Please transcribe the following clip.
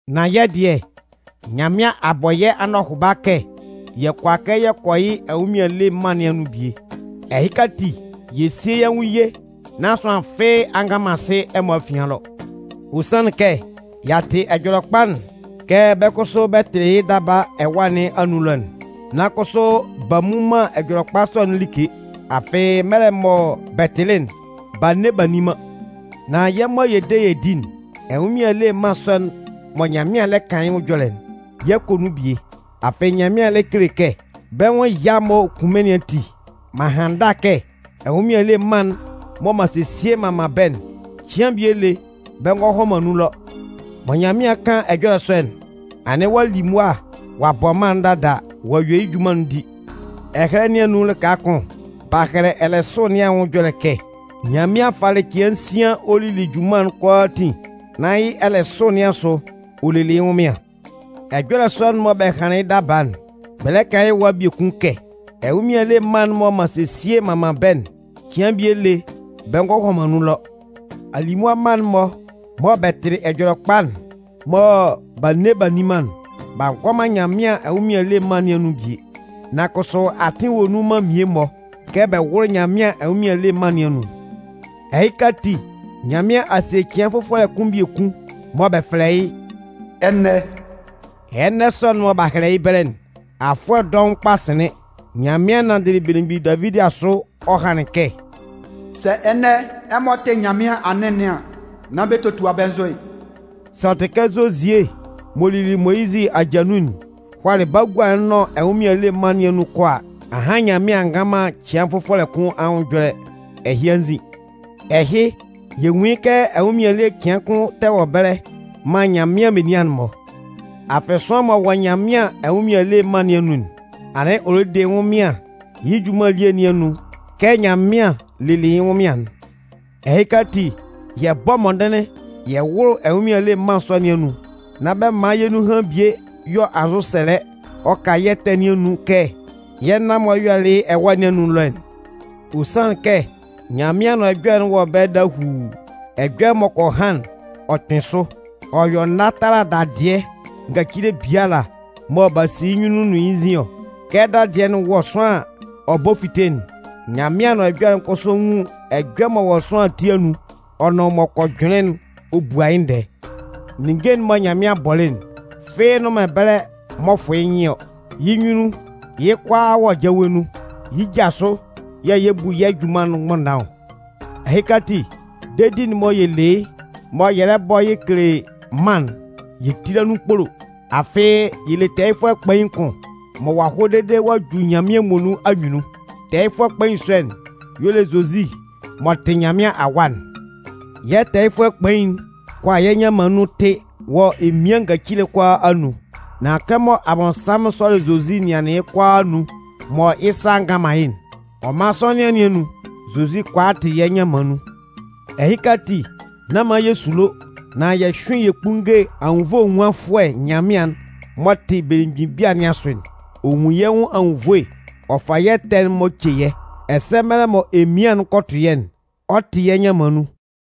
Nan yɛ́ dɩɛ, Nyanmɩan a bɔ yɛ́ anɔhʋba kɛ yɛ kʋala kɛ yɛ kɔ yɩ́ ɛnwʋnmɩan ele mân nɩn anun bie. Ɛhɩka ati, yɛ síe yɛ́ nwʋn ye nán sʋanlan fɩ́ɩ́ a nga man asɩ ɛmɔ afian ɛlɔ. Ɔ sanlɩn kɛ y'a tɩ Ɛjɔlɛkpa'n kɛ bɛ́ kʋsʋ bɛ tɩlɩ yɩ́ daba ɛwâ nɩn anun ɛlɔ'n. Nan kʋsʋ b'a mmu man Ɛjɔlɛkpa sɔ'n like. Afɩ, mɛlɛ mɔ bɛ tɩlɩ'n, b'a nne b'a nni man. Nan yɛ́ mɔ yɛ de yɛ di'n, ɛnwʋnmɩan ele mân sɔ'n mɔ Nyanmɩan lɛ kan yɩ́ ɛjɔlɛ'n, yɛ 'kɔ nun bie. Afɩ Nyanmɩan lɛ kele kɛ: Bɛ́ nwʋn ɛya'n m'ɔ kun mɩ́n nɩn ati, m'an han ndâ kɛ: Ɛnwʋnmɩan ele mân'n mɔ m'an sesie m'an man bɛ́'n, cɩan bie lé bɛ ngɔ hɔ man nun ɛlɔ. Mɔ Nyanmɩan 'kan ɛjɔlɛ sɔ'n, anɩn ɔ'a li mʋa ɔ'a bɔ mân'n dada ɔ'a yue yɩ́ junman'n di. Ɛhɛlɛ Ɛjɔlɛ nɩn anun lɩka kʋn, b'a hɛlɛ ɛlɛsʋ nɩn anwʋn ɛjɔlɛ kɛ: Nyanmɩan falɩ cɩan nsian ɔ lili yɩ́ junman'n kʋalaatin nan yɩ́ ɛlɛsʋ nɩn asʋ, ɔ lelɩ yɩ́ ɛnwʋnmɩan. Ɛjɔlɛ sɔ'n mɔ bɛ hanlɩn yɩ́ daba'n, bɛ lɛ kan yɩ́ ɛwa biekun kɛ: Ɛnwʋnmɩan ele mân'n mɔ m'an sesie m'an man bɛ́'n, cɩan bie lé bɛ ngɔ hɔ man nun ɛlɔ. Alimʋa mma'n-mɔ mɔ bɛ tɩlɩ Ɛjɔlɛkpa'n mɔ b'a nne b'a nni man'n, b'a ngɔ man Nyanmɩan ɛnwʋnmɩan ele mân nɩn anun bie. Nan kʋsʋ atɩn wɔ nun man mmie-mɔ kɛ bɛ wʋ́lʋ Nyanmɩan ɛnwʋnmɩan ele mân nɩn anun. Ɛhɩka ati, Nyanmɩan a sie cɩan fʋfɔlɛ kʋn biekun mɔ bɛ fɛlɛ yɩ́ “ɛnɛ”. Ɛnɛ sɔ'n mɔ b'a hɛlɛ yɩ́ ɛbɛlɛ'n, afʋɛ dɔʋn kpa sɩnlɩn, Nyanmɩan nanndɩlɩ belemgbin Davidi asʋ ɔ hanlɩn kɛ: Sɛ ɛnɛ ɛmɔ tɩ Nyanmɩan anɩn nɩn an, nán bɛ totua bɛ́ nzʋ'n. Sɛ ɔ tɩ kɛ Zozie m'ɔ lili Moyizɩ aja nun'n hʋalɩ bagua'n nʋn ɛnwʋnmɩan ele mân nɩn anun kɔ a, ahan Nyanmɩan a ngan man cɩan fʋfɔlɛ kʋ́n anwʋn ɛjɔlɛ ɛhɩ anzin. Ɛhɩ, yɛ nwun yɩ́ kɛ ɛnwʋnmɩan ele cɩan kʋn tɛ wɔ ɛbɛlɛ man Nyanmɩan menian'n-mɔ. Afɩ sʋanlan m'ɔ wɔ Nyanmɩan ɛnwʋnmɩan ele mân nɩn anun'n, anɩn ɔ lɛ de yɩ́ ɛnwʋnmɩan yɩ́ junman elie nɩn anun kɛ Nyanmɩan lelɩ yɩ́ ɛnwʋnmɩan'n. Ɛhɩka ati, yɛ bɔ́ mɔndɩnlɩn yɛ wʋ́lʋ ɛnwʋnmɩn ele mân sɔ nɩn anun. Nán bɛ man yɛ́ nunhan bie yɔ anzʋsɛlɛ ɔ ka yɩ́ ɛtɛ nɩn anun kɛ yɛ́ nan-mɔ yɔlɩ yɩ́ ɛwâ nɩn anun ɛlɔ'n. Ɔ sanlɩn kɛ Nyanmɩan Anʋan Ɛjɔlɛ'n wɔ ɛbɛlɛ dahuu, ɛjɔlɛ m'ɔ kɔ han'n, ɔ kpɩn sʋ. Ɔ yɔ nâ tala dadɩɛ ngacile biala mɔ b'a si yɩ́ nyunnun nʋn yɩ́ nzin ɔ. Kɛ dadɩɛ'n wɔ sʋanlan an, ɔ bɔ fite'n, Nyanmɩan Anʋan Ɛjɔlɛ'n kʋsʋ nwun ɛjɔlɛ m'ɔ wɔ sʋanlan ati anun ɔ nʋn m'ɔ kɔ jʋnlɩn'n ɔ bua yɩ́ ndɛɛ. Ninnge'n mɔ Nyanmɩan bɔlɩ'n, fɩ́ɩ́ nnʋn man ɛbɛlɛ m'ɔ fʋn yɩ́ nyɩn ɔ. Yɩ́ nyunnun, yɩ́ kʋalaa wɔ jawe nun. Yɩ́ ja asʋ yɛ̂ yɛ 'bu yɛ́ junman'n mgbʋnndan ɔ. Ɛhɩka ati, dedi'n mɔ yɛ le yɩ́ mɔ yɛ lɛ bɔ yɛ kele mân'n, yɛ tíla nun kpolo. Afɩ yɛ le tɛɛyɩfʋɛ kpain kʋn mɔ ɔ'a hɔ dede ɔ'a ju Nyanmɩan muonun anyunnun. Tɛɛyɩfʋɛ kpain sɔ'n y'ɔ le Zozi m'ɔ tɩ Nyanmɩan Awa'n. Yɛ́ tɛɛyɩfʋɛ kpain'n kʋala yɛ́ nyanman nun tɩ wɔ emian ngacile kʋalaa anun. Nan kɛmɔ Abɔnsanmʋn sɔlɩ Zozi nɩanlɩn yɩ́ kʋalaa anun mɔ yɩ́ sa a ngan man yɩ́'n, ɔ man sɔnɩan nɩn anun, Zozi kʋala tɩ yɛ́ nyanman nun. Ɛhɩka ati, nán man yɛ sulo, nan yɛ hyʋ́ɩn yɛ kpúnnge Anwunnvoe Enwunfʋɛ Nyanmɩan'n m'ɔ tɩ belemgbin bia nɩn asʋ'n. Ɔ nwun yɛ́ nwʋn anwunnvoe ɔ fa yɛ́ ɛtɛ'n-mɔ ce yɛ́. Ɛsɛ mɛlɛ mɔ emian'n kɔ tʋ yɛ́'n, ɔ 'tɩ yɛ́ nyanman nun.